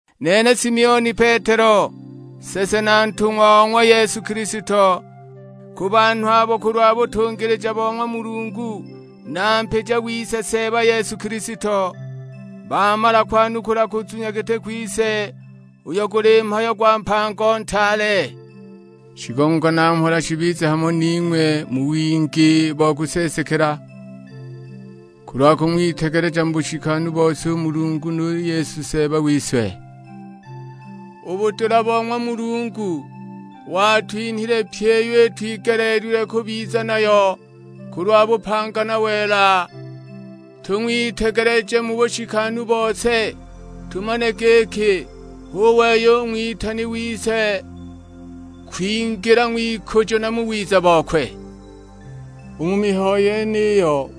Nene Simioni Petelo, nsese na ntung'wa o ng'wa Yesu Kilisto; ku banhu abo kulwa butungilija bo ng'wa Mulungu na Mpija wise Seeba Yesu Kilisto, bamala kwanukula kuzunya giti kwise, uyo guli mhayo gwa mpango ntaale. Shigongo na mhola shibize hamo ning'we mu wingi bo kuseesekela, kulwa kung'witegeleja mu bushikanu bose u Mulungu nu Yesu Seeba wise. U budula bo ng'wa Mulungu, watwinhile pyi iyo itwigeleelilwe kubiza nayo kulwa bupanga na wela, tung'witegeleje mu bushikanu bose; tumane giki hu wei u ng'witani wise kwingila ng'wikujo na mu wiza bokwe. U mu mihayo yeniyo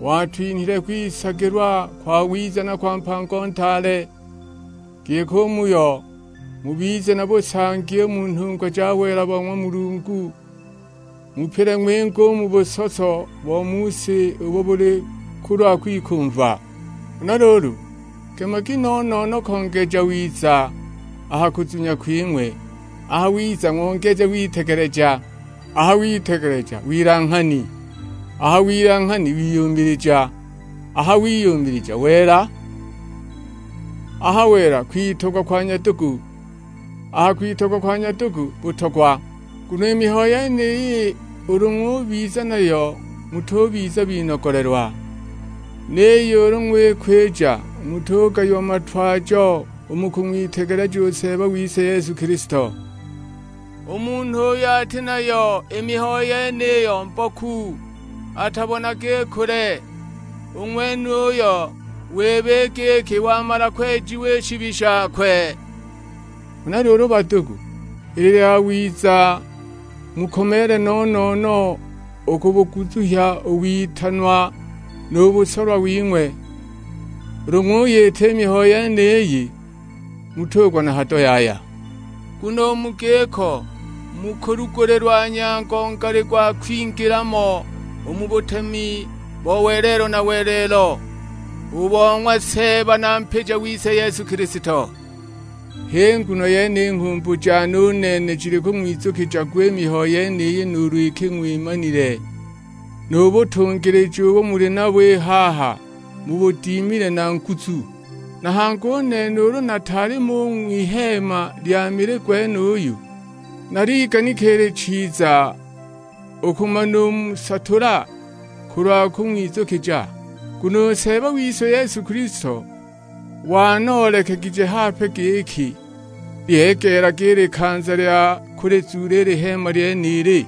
watwinhile kwisagilwa kwawiza na kwa mpango ntaale, giki u muyo, mubize na busangi u mu nhungwa ja wela bo ng'wa Mulungu, mupile ng'winge u mu busoso bo mu si ubo buli kulwa kwikumva. Huna luulu, gemagi no-no-no kongeja wiza a ha kuzunya kwing'we, a ha wiza ng'ongeje witegeleja. A ha witegeleja wilanghani, a ha wilanghani wiyumilija, a ha wiyumilija wela, a ha wela kwitogwa kwa nyadugu, a ha kwitogwa kwa nyadugu, butogwa. Nguno i mihayo yeniyi ulu ng'ubiza nayo mutubiza binogolelwa; niyo ulu ng'wikwija mutugayiwa matwajo u mu kung'witegeleja u Seeba wise Yesu Kilisto. U munhu uyo ati nayo i mihayo yeniyo mboku, atabonaga i kule; u ng'wenuyo wiba i giki wamala kwejiwa i shibi shakwe. Huna luulu badugu, ili yawiza mukomeele no-no-no u kubuguzuhya u witanwa nu busolwa wing'we; ulu ng'uyita i mihayo yeniyi, mutugwa na hado yaya. Nguno u mu giko, mukulugulilwa nyango ngali gwa kwingila mo u mu butemi bo welelo na welelo, u bo ng'wa Seeba na Mpija wise Yesu Kilisto. H'i nguno yene i nghumbu jane u nene jili kung'wizukija gwa i mihayo yeniyi nuulu iki ng'wimanile, nu butungilija ubo muli nabo i haha mubudimile na nguzu. Na hangi u nene ulu nataali mo u ng'wiheema lya mili gwenuyu, naliganika ili chiza u kumanumusatula kulwa kung'wizukija. Nguno u Seeba wise Yesu Kilisto wanoolekegije hape giki lyegeelaga i likanza lya kulizuula i liheema lyenili.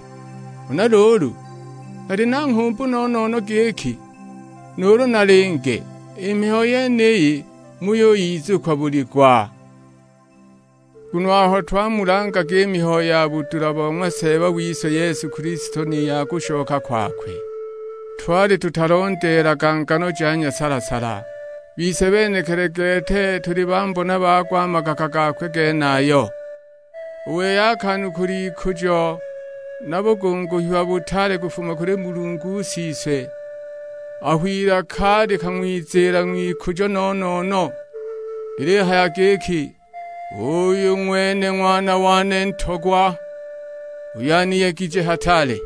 Huna luulu, nali na nghumbu no-no-no giki, nuulu nalinge, i mihayo yeniyi muyuyizukwa buli gwa. Nguno aho twamulangaga i mihayo ya budula bo ng'wa Seeba wise Yesu Kilisto ni ya kushoka kwakwe, twali tutalondeelaga ngano ja nyasala-sala, bise benekili gete tuli bambona bago a magaka gakwe genayo. U wei akanukula ikujo na bugunguhiwa butaale kufuma kuli Mulungu Siswe, aho ilaka likang'wiziila ng'wikujo no-no-no; lilihaya giki, "Uyu ng'wene Ng'wana wane Ntogwa uyo aniyegije hataale."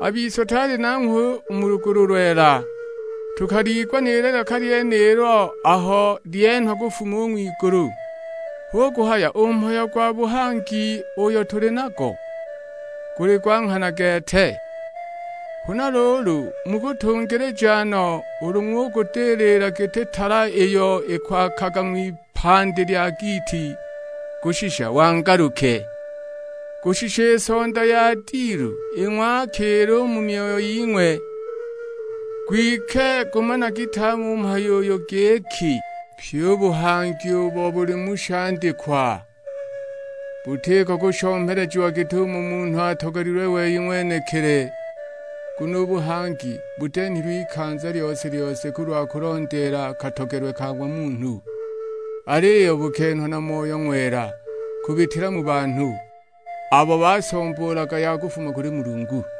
A bise twali nanghwe u mu lugulu lwela, tukaliigwa ni lilaka lyenilo aho lyenhwa kufuma u ng'wigulu. Hu kuhaya u mhayo gwa buhangi uyo tuli nago, guli gwa nghana gete. Huna luulu mukutungilija no ulu ng'ugudilila giti tala iyo ikwaakaga ng'wipandi lya giiti, kushisha wangaluke; kushisha i sonda ya dilu ing'wakiile u mu myoyo ying'we. Kwike gumanagi tame u mhayo uyu; giki, pyi u buhangi ubo buli mu shandikwa butiko kushomelejiwa git'umo munhu atogelilwe wei ng'wenekili. Nguno u buhangi butenhilwe ikanza lyose-lyose kulwa kulondeela katogelwe ka ng'wa munhu, aliyo bukenhwa na Moyo Ng'wela kubitila mu banhu, abo basomboolaga ya kufuma kuli Mulungu.